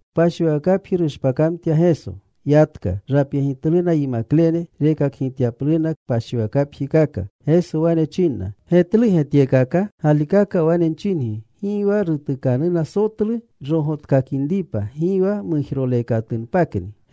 Kpashiwakapji rushpakamtya Geso. Yatka. Rapyegitluna yimaklene, rekakgityapluna kpashiwakapjikaka. Geso wane chinna. “¿Getluge tyekaka? Galikaka wane nchingi, gi wa rutukanuna sotlu rogotkakinripa, gi wa mujroleekatunpakni.”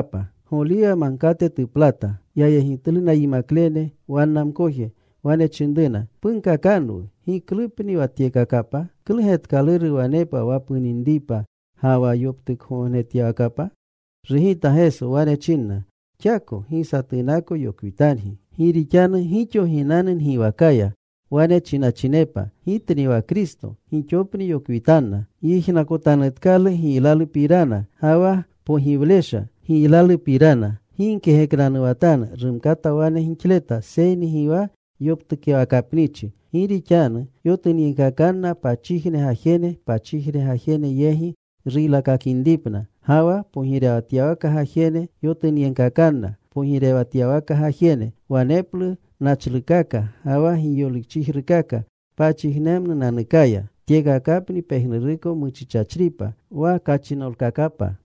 Goliwa Magkate tuplata. Yayegitluna yinaklene wanna mkoje. Wane chinruna, “Punkakanwu. ¿Giklupni wa tyekakapa? ¿Klu getkaluru wanepa wa puninipa ga wa yoptukgognetyawakapa?” Rugita Geso. Wane chinna, “Xako gi satunako yokwitangi. Gi rixanu gixo ginanu ngiwakaya. Wane chinachinepa, ‘Gitni wa Kristo.’ Gixopni yokwitanna. Gyijnakotanutkalu giylalupirana ga wa pogiwlesha giylalupirana. Gi gkegeknanuwatanu. Rumkata wane gixleta, seyni gi wa yoptukyawakapnichi. Gi rixanu yotunyegkakanna pachijne gajene pachijne gajene yegi ruylakakinripna. Ga wa pogirewatyawaka gajene yotunyegkakanna pogirewatyawaka gajene. Waneplu nachlukaka ga wa giyolikchijrukaka pachijnemnunanukaya. Tyekakapni pejnuruko muchichachripa wa kachinolkakapa.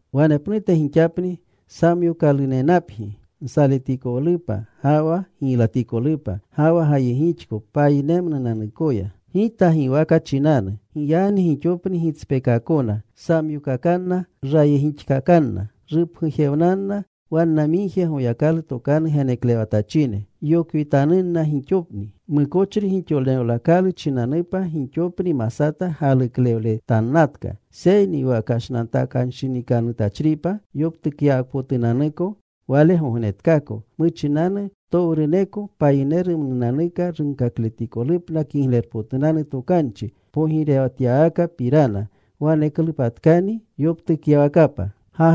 “Wanepnute gixapni samyokalunenapgi nsaletikolupa ga wa giylatikolupa. Ga wa gayegixko payinemnunanukoya Gita giwaka chinanu. Giyagni gixopni gitspekaakona. Samyookakanna. Rayegixkakanna. Rupgujewnanna wanna migje Goyakalu tokanu geneklewatachine. Yokwitanunna gixoni. Mukochri gixolewnakalu chinanupa, gixopni masata galuklewletannatka. Seyni wa kashnantakanshinikanutachripa yoptukyawakapotunanuko wale gognetkaako. Muchinanu ptowruneko payinerumnunanuka runkakikolupna Kiglerpotunanu Tokanchi pogirewatyawakapirana. Waneklupatkani yoptukyawakapa.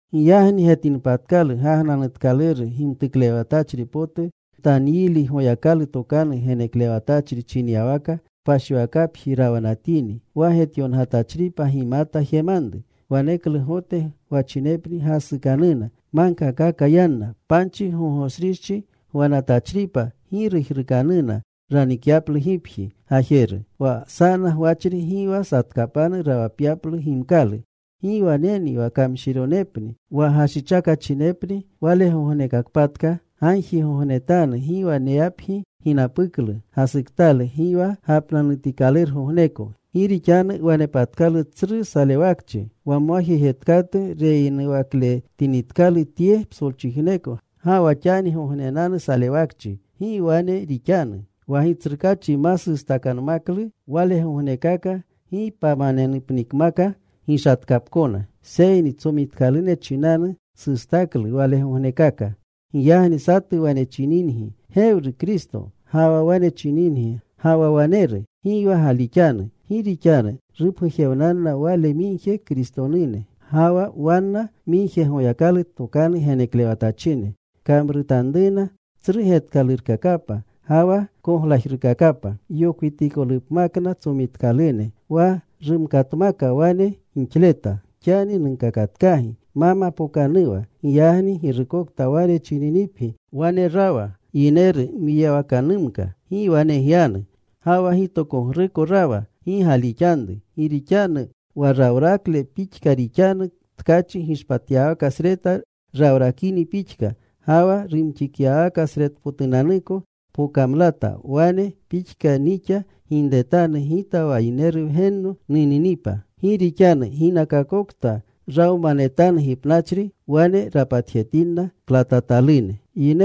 “Giyagni getinpatkalu gagnanutkaluru gimtuklewatachri potu, Ntanyili, Goyakalu tokanu geneklewatachri chinyawaka, kpashiwakapji rawanatini, (Wa getyongatachripa gimata jemanru), waneklu Gote gwachinepni gasukanuna. Magkakaka yanna. Panchi gogoshrichi gwanatachripa gi gijrukanuna ranikyaplu gipji gajeru. Wa sana gwachri gi wa satkapanu rawapyaplu gimkalu. ¡Gi waneni wa kamshironepni wa gashichakachinepni wale gognekakpatka! Gagjigognetanu gi waneyapgi ginapuklu gasuktalu, gi wa gapnanutikalurgogneko. Gi rixanu wanepatkalu tsru salewakchi wa mwajejetkatu reyinuwakletinitkalu tye psolchijneko ga wa xanigognenanu salewakchi. Gi wane rixanu. Wa Gitsrukaachi ma sustakanmaklu walegognekaka gi pamanenupnikmaka gishatkapkona, seyni tsomitkalune chinanu sustaklu walegognekaka. Giyagni satu wane chininipgi, ‘Gewru Kristo,’ ga wa wane chininipgi, ‘Ga ga waneru,’ gi wa galixanu. Gi rixanu rupgujewnanna wale migje Kristone, ga wa wanna migje Goyakalu tokanu geneklewatachine. Kamrutanruna tsru getkalurkakapa ga wa koglajrukakapa yokwitikolupmakna tsomitkalune wa rumkatmaka wane gixleta. Xani nunkakatkagi ma mapookanuwa. “Giygani girukokta wane chininipgi, ‘Wane rawa, yineru mwiyawakanumka,’ Gi wane gyanu. Ga wa ‘Gitokogruko rawa,’ gi galixanru. Gi rixanu, wa rawrakle pixka rixanu, tkachi gishpatyawakasreta rawrakini pixka ga wa rumxityawakasretpotunanuko pokamlata, wane pixka nixa ginretanu Gita wa Yineru Wgenno nuninipa. Gi rixanu ginakakokta rawmanetanu gipnachri, wane rapatjetinna klatatalune.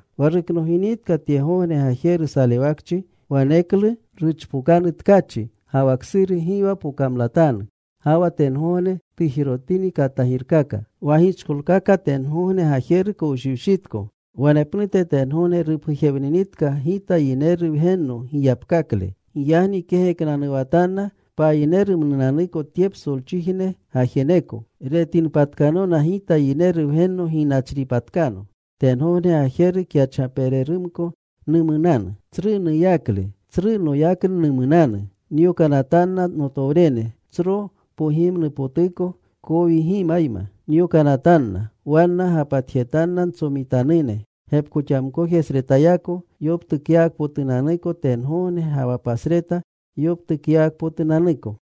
“Wa ruknoginitka tyegogne gajeru salewakchi, waneklu: Ruchpokanu tkachi. Ga wa ksuru gi wa pokamlatanu. Ga wa tengogne tujirotini katagirkaka. Wa gichkolkaka tengogne gajeru kowshiwshitko “Wanepnute tengogne rupgujewninitka Gita Yineru Wgenno yigapkakle. Giyagni kegeknanuwatanna payinerumnunanuko tye psolchijne gajeruko. Retinpatkanona Gita Yineru Wgenno ginachripatkano. Tengogne gajeru kyachgapererumko numunanu. Tsru nuyakle, tsru noyaknu numunanu. Nyokanatanna notowrene. Tsro pogimnupotuplo kowgimayma nyokanatanna. Wanna gapatjetanna ntsomitanune gepkoxamkojesretayako, yoptukyawakapotunanuko tengogne ga wa pasreta yoptukyawakpotunanuko.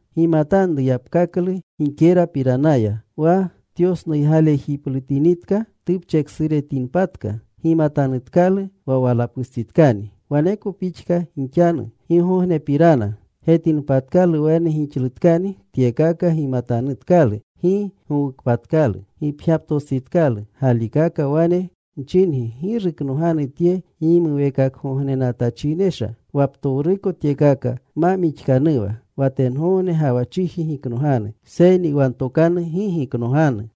“Gimatanru yapkaklu gikerapiranaya. Wa tyosnuygalejiplutinitka, tupcheksuretinpatka, gimatanutkalu wa walapustsitkani. Waneko pixka gixanu gigognepirana. Getinpatkalu wane gixlutkani tyekaka, gimatanutkalu gi gowukpatkalu. Gipgyaptostsitkalu. Galikaka wane nchingi, gi ruknoganu tye gimuweekakgognenatachinesha wa ptowruko tyekaka ma mixkanuwa. Wa tengogne ga wa chiji giknoganu, seyni wa ntokanu gi giknoganu.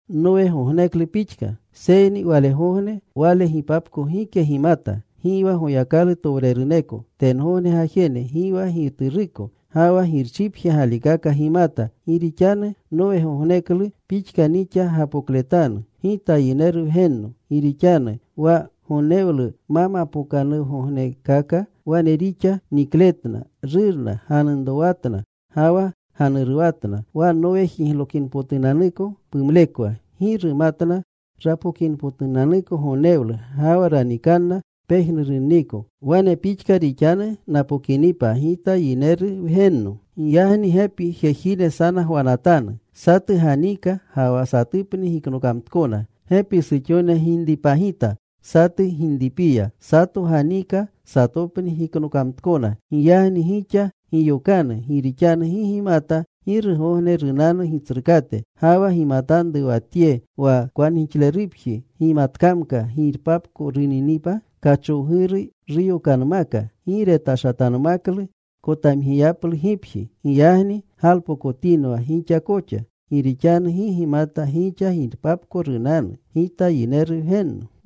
“Seyni walegogne, wale gipapko, gike gimata, gi wa Goyakalu towreruneko tengogne gajene, gi wa Gituruko, ga wa Girchipje galikaka gimata. Gi rixanu Nowgogneklu pixka nixa gapokletanu Gita Yineru Wgenno. Gi rixanu wa gonnewlu ma mapookanuwagognekaka wane rixa nikletna, rurna, ganunrowatna, ga wa ganuruwatna wa Nowe jiglokingognepotunanuklo pumlekwa. Gi rumatna rapokinipotunanuko gonnewlu ga wa ranikanna pejnurunniko. Wane pixka rixanu napokinipa Gita Yineru Wgenno. Giyagni gepi jejine sana gwanatanu. Satu ganiika ga wa satupni giknokamtkona. Gepi suxone ginripagita satu ginripiya. Sato ganiika. Satopni giknokamtkona. “Giyagni gixa giyokanu. Gi rixanu gi gimata girugogne runanu Gitsrukate. Ga wa gimatanru wa tye. Wa kwangixlerupji gimatkamka girpapko runinripa kachowguru, ruyokanmaka. Gi retashatanmaklu kotamgiyaplu gipji. Giyagni galpokotinwa gixa koxa, gi rixanu gi gimata gixa girpapko nunanu Gita Yineru Wgenno.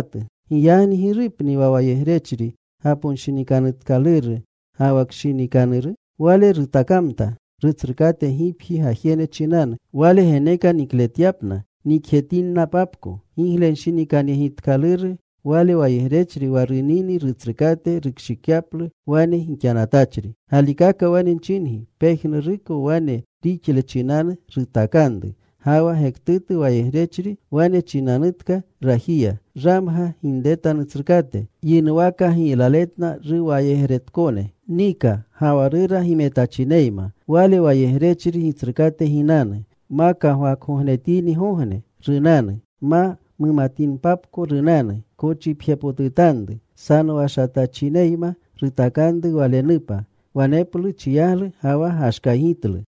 “Giyagni ¿girupni wa wayegrechri gaponshinikanutkaluru ga wa kshinikanuru? Wale rutakamta rutsrukate gipji gajene chinanu, wale geneka nikletyapna nikjetinnapapko. Giglenshinikanyegitkaluru wale wayegrechri wa runini rutsrukate rukshikyaplu wane gixanatachri. Galikaka wane nchingi pejnuruko wane rixle chinanu rutakanru. Ga wa gektutu wayegrechri wane chinanutka rajiya, ‘Ramga ginreta Nutsrukate,’ Yinuwaka giylakletletna ruwayegretkone. Nika, ga wa rura gimetachineyma. Wale wayegrechri gitsrukate ginanu. Ma kagwakgognetinitgogne, runanu. Ma mumatinpapko runanu. Kochipjepotutanru. Sanowashatachineyma rutakanru walenupa. Waneplu chiyaglu ga wa gashkaygitlu.